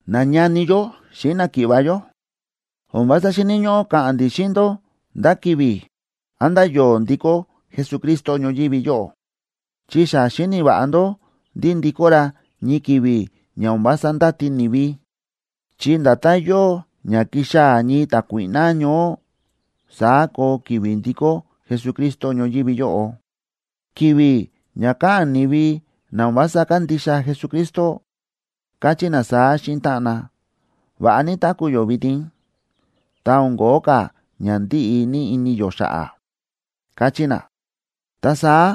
Nañani yó xíꞌin náki̱ꞌva̱ yó, o̱n vása xíni̱ ñóꞌó ka̱ꞌa̱n ndi̱ xíꞌin ndó ndá ki̱vi̱, án ndá yo̱o̱ ndikó Jesucristo ñoyívi yóꞌo, chi xa xíni̱ va̱ꞌa ndó ndí ndikó ra ñii ki̱vi̱ ña o̱n vása ndáti ni̱vi, chi nda̱tán yóo ña kixaa̱ ñii ta̱kuíꞌná ñoó, saá koo ki̱vi̱ ndikó Jesucristo ñoyívi yóꞌo. Ki̱vi̱ ña káꞌa̱n ni̱vi na o̱n vása kándixa Jesucristo, káchí na saá xíꞌin táꞌan na: “Va̱ꞌa ní táku̱ yó vitin, ta o̱n ko̱ó ka̱ ña ndíꞌi ini yó xa̱ꞌa̱”, káchí na, ta saá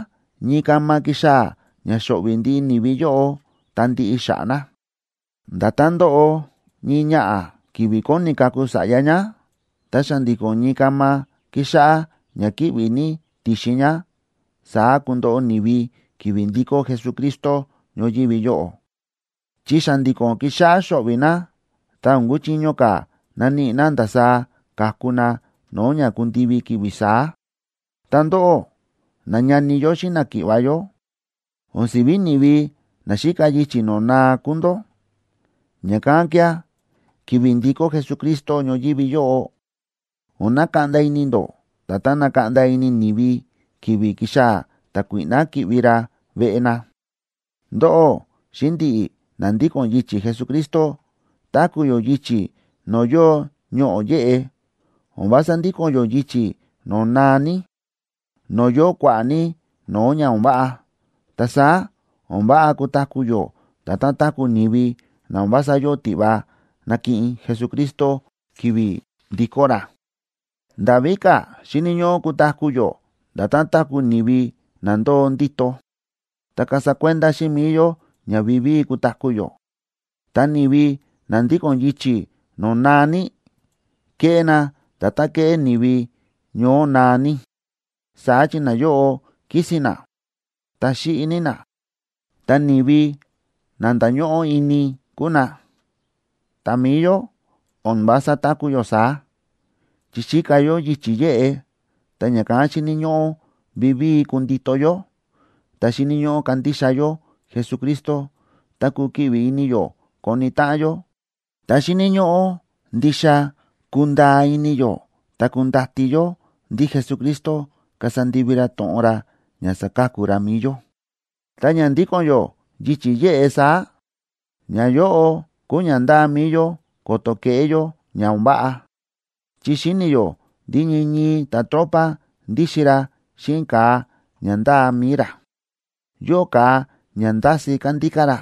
ñii kama kixaa̱ ña xo̱ꞌvi̱ ndiꞌi ni̱vi yóꞌo ta ndiꞌi xa̱ꞌa̱ na. Nda̱tán ndóꞌo ñii ñaꞌa̱ ki̱vi̱ kóni kaku sa̱ꞌya ñá, ta xa̱ndi̱ko̱n ñii kama kíxáꞌá ña kíꞌvi̱ ní ti̱xin ñá, saá kundoꞌo ni̱vi ki̱vi̱ ndikó Jesucristo ñoyívi yóꞌo, chi xa̱ndi̱ko̱n kixáꞌá xo̱ꞌvi̱ na, ta o̱n kuchiño ka̱ naníꞌi na ndasaá ka̱ku na no̱o̱ ña kundivi ki̱vi̱ saá. Ta ndóꞌó, nañani yó xíꞌin náki̱ꞌva̱ yó, o̱n si̱ví ni̱vi na xíka yichi̱ no̱o̱ naa kúu ndó. Ña̱kán kía̱, ki̱vi̱ ndikó Jesucristo ñoyívi yóꞌo, o̱n nakaꞌnda ini ndó nda̱tán nákaꞌnda ini ni̱vi ki̱vi̱ ki̱xaa̱ ta̱kuíꞌná ki̱ꞌvi ra veꞌe na. Ndóꞌó xíꞌin ndi̱ꞌi̱ na ndíko̱n yichi̱ Jesucristo, táku̱ yó yichi̱ no̱o̱ yóo ñoꞌo̱ yéꞌe; o̱n vása ndíko̱n yó yichi̱ no̱o̱ naa ní, no̱o̱ yóo kua̱ꞌa̱ ní no̱o̱ ña o̱n váꞌa. Ta saá o̱n váꞌa kutaku̱ yó nda̱tán táku̱ ni̱vi na o̱n vása yóo tiꞌva nakiꞌin Jesucristo ki̱vi̱ ndikó ra. Nda̱ víka̱ xíni̱ ñóꞌó kutaku̱ yó nda̱tán táku̱ ni̱vi na ndóo ndíto, ta kasa kuenda xíꞌin mi̱i yó ña vivíi kutaku̱ yó. Ta ni̱vi na ndíko̱n yichi̱ no̱o̱ naa ní, kéꞌé na nda̱tán kéꞌé ni̱vi ñoó naa ní. Saá chi nayóꞌo kísi̱n na, ta xíꞌi ní na, ta ni̱vi na ndáñóꞌó ini kúu na. Ta mi̱i yó, o̱n vása táku̱ yó saá, chi xíka yó yichi̱ yéꞌe, ta ña̱kán xíni̱ ñóꞌó vivíi kundito yó, ta xíni̱ ñóꞌó kandixa yó Jesucristo, ta kukiꞌvi ini yó koni táꞌan yó. Ta xíni̱ ñóꞌó ndixa kundaa ini yó ta kundati yó ndí Jesucristo kasa ndivi ra to̱ꞌon ra ña saka̱ku ra mi̱i yó. Ta ña ndíko̱n yó yichi̱ yéꞌe saá, ñayóꞌo kúu ña ndáa mi̱i yó ko̱to̱ keꞌé yó ña o̱n váꞌa. Chi xíni̱ yó ndí ñii ñii ta̱tropa ndíxin ra xíꞌin ka̱a ña ndáa mi̱i ra; yóo ka̱a ña ndási kándíká ra,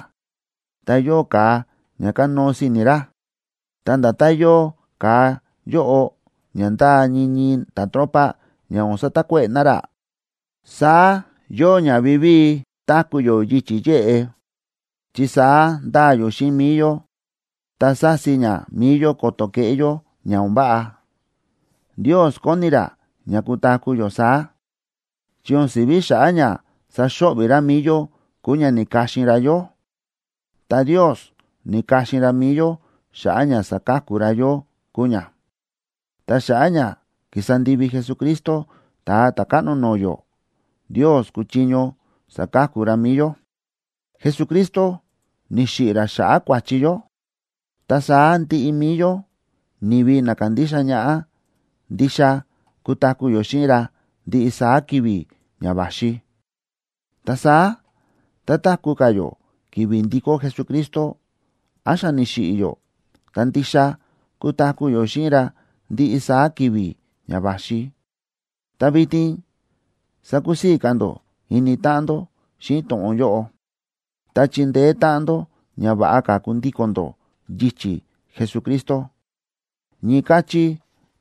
ta yóo ka̱a ña kánóo si̱ni̱ ra. Ta nda̱tán yóo ka̱a yóꞌo ña ndáa ñii ñii ta̱tropa ña o̱n satakuéꞌe̱ na ra, saá yóo ña vivíi táku̱ yó yichi̱ yéꞌe, chi saá ndáa yó xíꞌin mi̱i yó ta sási ña mi̱i yó ko̱to̱ keꞌé yó ña o̱n váꞌa. Ndios kóni ra ña kutaku̱ yó saá, chi o̱n si̱ví xa̱ꞌa̱ ña saxo̱ꞌvi̱ ra mi̱i yó kúu ña ni̱ka̱xin ra yó. Ta Ndios ni̱ka̱xin ra mi̱i yó xa̱ꞌa̱ ña saka̱ku ra yó kúu ña. Ta xa̱ꞌa̱ ña ki̱sa ndivi Jesucristo, Ta̱a Ta̱káꞌno no̱o̱ yó, Ndios kúchiño saka̱ku ra mi̱i yó. Jesucristo ni̱xiꞌi̱ ra xa̱ꞌa̱ kua̱chi yó. Ta saá ndiꞌi mi̱i yó, ni̱vi na kándixa ñaꞌá, ndixa kutaku̱ yó xíꞌin ra ndiꞌi saá ki̱vi̱ ña va̱xi. Ta saá tá táku̱ ka̱ yó ki̱vi̱ ndikó Jesucristo, án xa ni̱xiꞌi̱ yó, ta ndixa kutaku̱ yó xíꞌin ra ndiꞌi saá ki̱vi̱ ña va̱xi. Ta vitin sakusii̱ ka̱ ndó ini táꞌan ndó xíꞌin to̱ꞌon yóꞌo, ta chindeé táꞌan ndó ña va̱ꞌa ka̱ kundíko̱n ndó yichi̱ Jesucristo. Ñii káchí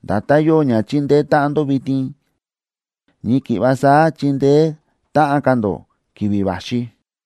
nda̱tán yóo ña chíndeé táꞌan ndó vitin, ñii ki̱ꞌva saá chindeé táꞌan ka̱ ndó ki̱vi̱ va̱xi.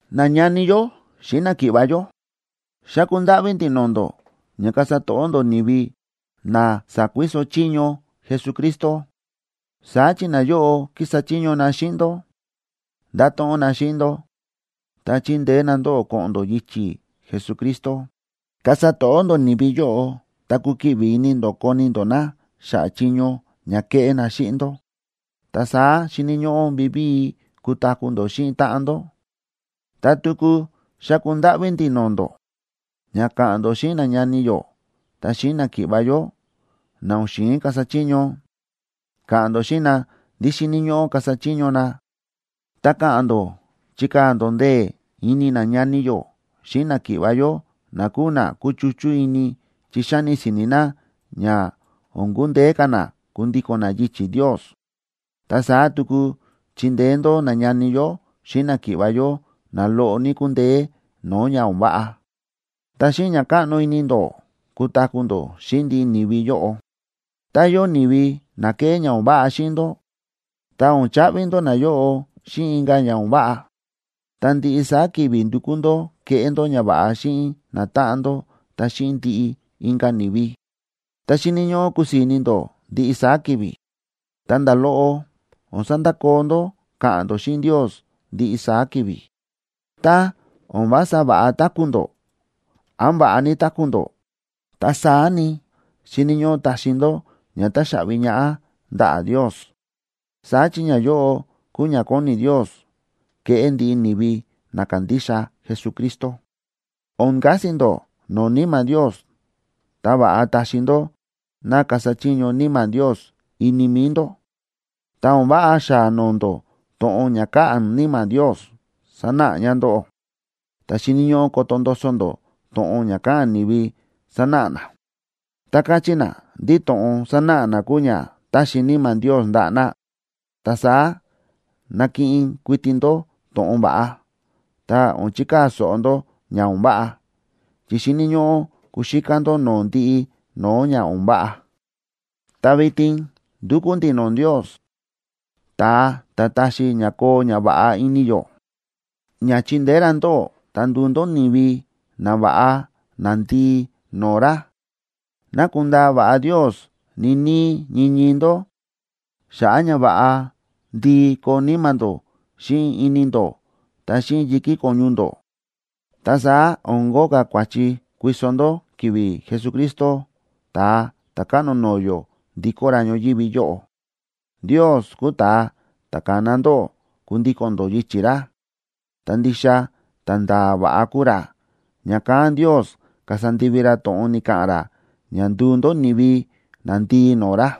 Nañani yó xíꞌin náki̱ꞌva̱ yó, xáku ndáꞌví ndi̱ no̱o̱ ndó ña kasa to̱ꞌó ndó ni̱vi na sa̱kuiso chiño Jesucristo. Saá chi nayóꞌo kísa chiño na xíꞌin ndó, ndáto̱ꞌon na xíꞌin ndó, ta chíndeé na ndóꞌó ko̱ꞌo̱n ndó yichi̱ Jesucristo. Kasa to̱ꞌó ndó ni̱vi yóꞌo ta kukiꞌvi ini ndó koni ndó na xa̱ꞌa̱ chiño ña kéꞌé na xíꞌin ndó. Ta saá xíni̱ ñóꞌó vivíi kutaku̱ ndó xíꞌin táꞌan ndó. Ta tuku xáku ndáꞌví ndi̱ no̱o̱ ndó, ña ka̱ꞌa̱n ndó xíꞌin nañani yó ta xíꞌin náki̱ꞌva̱ yó, na o̱n xi̱in kasa chiño. Ka̱ꞌa̱n ndó xíꞌin na ndí xíni̱ ñóꞌó kasa chiño na. Ta ka̱ꞌa̱n ndó chikaa̱ ndó ndee̱ ini nañani yó xíꞌin náki̱ꞌva̱ yó na kúu na kúchuchú ini chi xáni si̱ni̱ na ña o̱n kundeé ka̱ na kundíko̱n na yichi̱ Ndios. Ta saá tuku chindeé ndó nañani yó xíꞌin náki̱ꞌva̱ yó na loꞌo ní kúndeé no̱o̱ ña o̱n váꞌa. Ta xíꞌin ña káꞌno ini ndó kutaku̱ ndó xíꞌin ndiꞌi ni̱vi yóꞌo. Tá yóo ni̱vi na kéꞌé ña o̱n váꞌa xíꞌin ndó, ta o̱n chaꞌvi ndó nayóꞌo xíꞌin inka̱ ña o̱n váꞌa. Ta ndiꞌi saá ki̱vi̱ ndukú ndó keꞌé ndó ñava̱ꞌa xíꞌin natáꞌan ndó ta xíꞌin ndiꞌi inka̱ ni̱vi. Ta xíni̱ ñóꞌó kusii̱ ní ini ndó ndiꞌi saá ki̱vi̱. Ta nda̱ loꞌo o̱n sandakoo ndó káꞌa̱n ndó xíꞌin Ndios ndiꞌi saá ki̱vi̱. Tá o̱n vása va̱ꞌa táku̱ ndó, án va̱ꞌa ní táku̱ ndó, ta saá ni, xíni̱ ñóꞌó taxi ndó ña táxaꞌvi ñaꞌá ndaꞌa̱ Ndios. Saá chi ñayóꞌo kúu ña kóni Ndios keꞌé ndiꞌi ni̱vi na kándixa Jesucristo. O̱n kasi ndó no̱o̱ Níma̱ Ndios, ta va̱ꞌa taxi ndó ná kasa chiño Níma̱ Ndios ini mi̱i ndó. Ta o̱n váꞌa xáa noo ndó to̱ꞌon ña káꞌa̱n Níma̱ Ndios sanáꞌa ña ndóꞌó. Ta xíni̱ ñóꞌó koto ndoso ndó to̱ꞌon ña káꞌa̱n ni̱vi sánáꞌa na, tá káchí na ndí to̱ꞌon sánáꞌa na kúu ña ta̱xi Níma̱ Ndios ndaꞌa̱ na. Ta saá nakiꞌin kuiti ndó to̱ꞌon va̱ꞌa, ta o̱n chikaa̱ so̱ꞌo ndó ña o̱n váꞌa. Chi xíni̱ ñóꞌó kuxíká ndó no̱o̱ ndiꞌi no̱o̱ ña o̱n váꞌa. Ta vitin ndúkú ndi̱ no̱o̱ Ndios, ta̱a ta̱ táxi ña koo ñava̱ꞌa ini yó, ña chindeé ra ndóꞌó ta nduu ndó ni̱vi nava̱ꞌa nandii no̱o̱ ra. Ná kundaa va̱ꞌa Ndios ñii níí ñii ñii ndó xa̱ꞌa̱ ña va̱ꞌa ndii koo níma̱ ndó xíꞌin ini ndó ta xíꞌin yi̱kí ko̱ñu ndó. Ta saá o̱n kóo ka̱ kua̱chi kuiso ndó ki̱vi̱ Jesucristo, Ta̱a Ta̱káꞌno no̱o̱ yó, ndikó ra ñoyívi yóꞌo. Ndios kúu ta̱a ta̱ ka̱na ndóꞌó kundíko̱n ndó yichi̱ ra, ta ndixa ta̱nda̱a̱ va̱ꞌa kúu ra, ña̱kán Ndios kasa ndivi ra to̱ꞌon ni̱ka̱ꞌa̱n ra ña nduu ndó ni̱vi nandii no̱o̱ ra.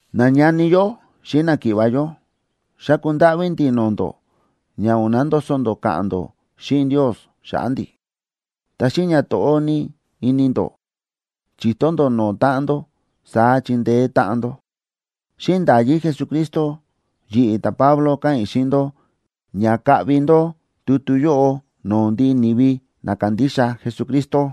Nañani yó xíꞌin náki̱ꞌva̱ yó, xáku ndáꞌví ndi̱ no̱o̱ ndó ña o̱n nandoso ndó ka̱ꞌa̱n ndó xíꞌin Ndios xa̱ꞌa̱ ndi̱. Ta xíꞌin ñato̱ꞌó ní ini ndó, chi̱to ndó no̱o̱ táꞌan ndó, saá chindeé táꞌan ndó. Xíꞌin nda̱yí Jesucristo, yi̱ꞌi̱ ta̱Pablo káꞌa̱n i̱ xíꞌin ndó ña kaꞌvi ndó tutu yóꞌo no̱o̱ ndiꞌi ni̱vi na kándixa Jesucristo.